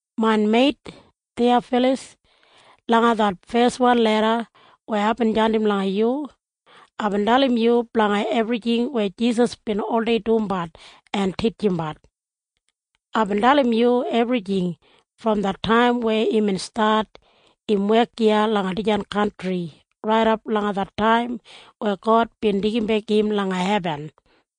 Main meit Thiyafalas, langa det feswan leda weya aibin jandim langa yu, aibin dalim yu blanga ebrijing weya Jisas bin oldei dumbat en titjimbat. Aibin dalim yu ebrijing brom det taim weya imbin stat im wek iya langa dijan kantri raidap langa det taim weya God bin deigimbek im langa hebin.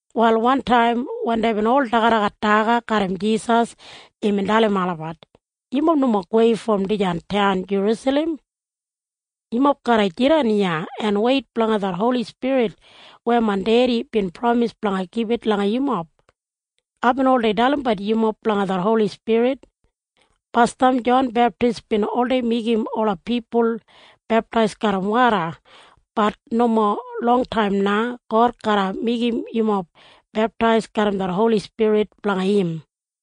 Wal wantaim wen deibin ol dagadagat daga garram Jisas, imbin dalim olabat, “Yumob nomo gowei brom dijan taun Jerusalem. Yumob garra jidan iya en weit blanga det Holi Spirit weya main Dedi bin pramis blanga gibit langa yumob. Aibin oldei dalimbat yumob blanga det Holi Spirit. Basdam Jon Beptis bin oldei meigim ola pipul beptais garram woda. Bat nomo longtaim na God garra meigim yumob beptais garram det Holi Spirit blanga im.”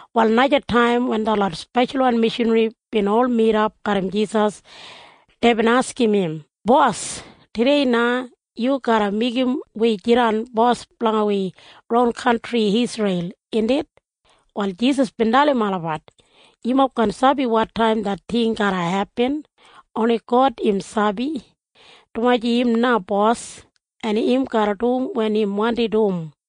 Wal naja taim wen detlot speshalwan mishanri bin ol midap garram Jisas, deibin askim im, “Bos, tudei na yu garra meigim wi jidan bos blanga wi ron kantri Isreil, indit?” Wal Jisas bin dalim olabat, “Yumob kaan sabi wotaim det ting garra hepin. Oni God im sabi, dumaji im na Bos, en im garra dum wen im wandim dum.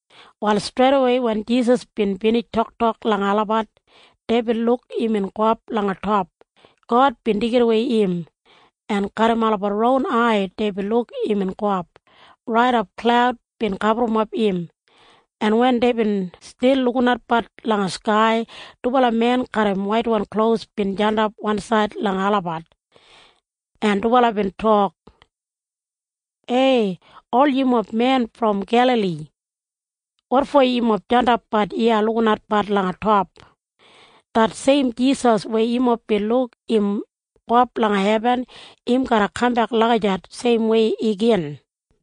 Wal streidawei wen Jisas bin binij toktok langa olabat, deibin luk imbin gowap langa top. God bin deigidawei im, en garram olabat ron ai deibin luk imbin gowap, raidap klaud bin gaburrumap im. En wen deibin stil lukinatbat langa skai, dubala men garram waitwan klos bin jandap wansaid langa olabat, en dubala bin tok, “Ei! Ol yumob men brom Gelali! Wotfo yumob jandapbat iya lukinatbat langa top? Det seim Jisas weya yumob bin luk im gowap langa hebin, im garra kambek lagijat seimwei igin.”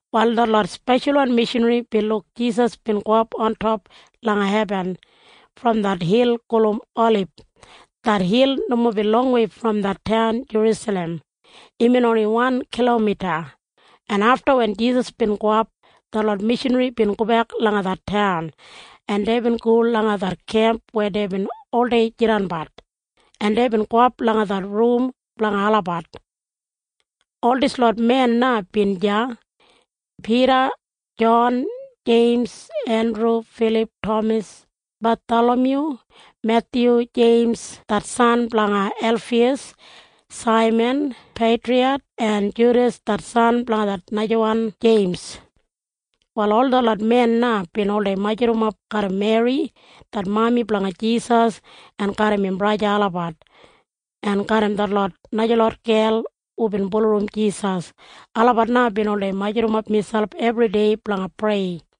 Wal detlot speshalwan mishanri bin luk Jisas bin gowap ontop langa hebin brom det hil gulum Olib. Det hil nomo bin longwei brom det taun Jerusalem. Imbin oni wan kilomita, en afta wen Jisas bin gowap, detlot mishanri bin gobek langa det taun, en deibin go langa det kemp weya deibin oldei jidanbat, en deibin gowap langa det rum blanga olabat. Ol dislot men na bin deya, Pida, Jon, Jeims, Endru, Filip, Tamas, Bathalamyu, Methyu, Jeims det san blanga Elfiyas, Saiman Peitriyat, en Judas det san blanga najawan Jeims. Wal ol detlot men na bin oldei majurrap garram Meri det mami blanga Jisas en garram im braja olabat en garram detlot najalot gel hubin bulurrum Jisas. Olabat na bin oldei majurrumap miselp ebridei blanga prei.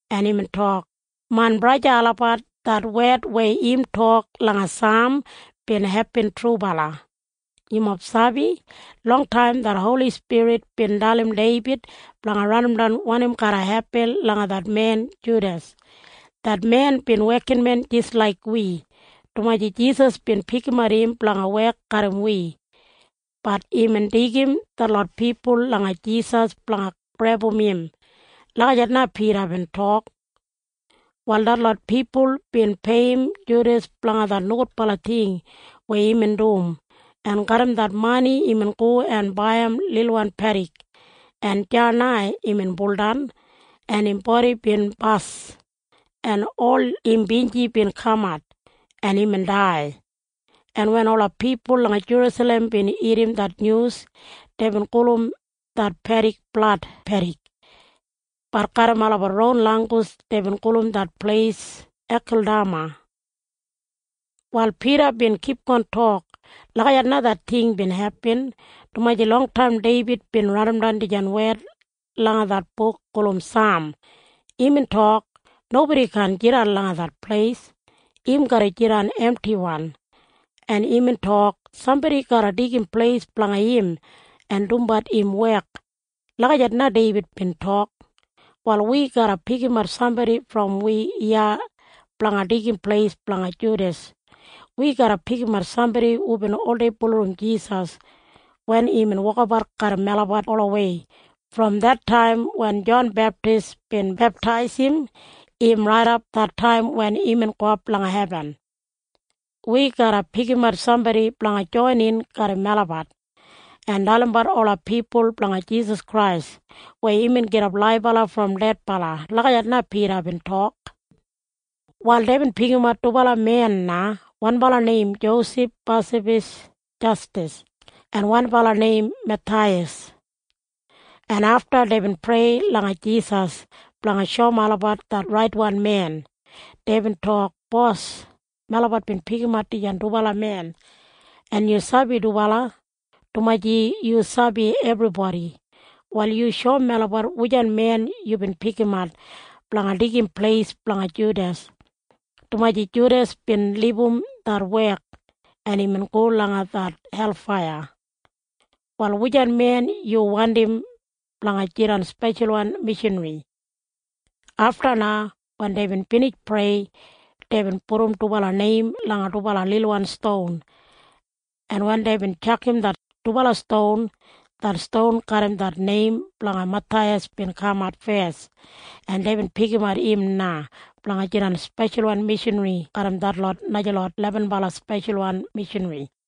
en imbin tok, “Main braja olabat, det wed weya im tok langa Saam bin hepin trubala. Yumob sabi? Longtaim det Holi Spirit bin dalim Deibid blanga raidimdan wanim garra hepin langa det men Judas. Det men bin wekinmen jis laik wi, dumaji Jisas bin pikimat im blanga wek garram wi. Bat imbin deigim detlot pipul langa Jisas blanga grebum im.” Lagijat na Pida bin tok. Wal detlot pipul bin peiyim Judas blanga det nogudbala ting weya imbin dum, en garram det mani imbin go en baiyim lilwan pedik, en deya na imbin buldan, en im bodi bin bas, en ol im binji bin kamat, en imbin dai, en wen ola pipul langa Jerusalem bin irrim det nyus, deibin gulum det pedik Blad Pedik. Bat garram olabat ron langgus dei gulum det pleis Ekeldama. Wal Pida bin kipgon tok, “Lagijat na det ting bin hepin, dumaji longtaim Deibid bin raidimdan dijan wed langa det buk gulum Saam. Imbin tok, ‘Nobodi kaan jidan langa det pleis. Im garra jidan emtiwan.’ En imbin tok, ‘Sambodi garra deigim pleis blanga im en dumbat im wek.’ Lagijat na Deibid bin tok. “Wal wi garra pikimat sambodi brom melabat iya blanga deigim pleis blanga Judas. Wi garra pikimat sambodi hubin oldei bulurrum Jisas wen imbin wokabat garram melabat olawei brom det taim wen Jon Beptis bin beptaisim im raidap det taim wen imbin gowap langa hebin. Wi garra pikimat sambodi blanga joinin garram melabat en dalimbat ola pipul blanga Jisas Krais weya imbin gidap laibala brom dedbala.” Lagijat na Pida bin tok. Wal deibin pikimat dubala men na, wanbala neim Josef Basabas Jastas en wanbala neim Mathaiyas, en afta deibin prei langa Jisas blanga shoum olabat det raitwan men. Deibin tok, “Bos, melabat bin pikimat dijan dubala men, en yu sabi dubala, dumaji yu sabi ebribodi. Wal yu shoum melabat wujan men yubin pikimat blanga deigim pleis blanga Judas, dumaji Judas bin libum det wek, en imbin go langa det helfaiya. Wal wujan men yu wandim blanga jidan speshalwan mishanri?” Afta na wen deibin binij prei, deibin pudum dubala neim langa dubala lilwan ston, en wen deibin tjakam det dubala ston, det ston garram det neim blanga Mathaiyas bin kamat fes, en deibin pikimat im na blanga jidan speshalwan mishanri garram detlot najalot lebenbala speshalwan mishanri.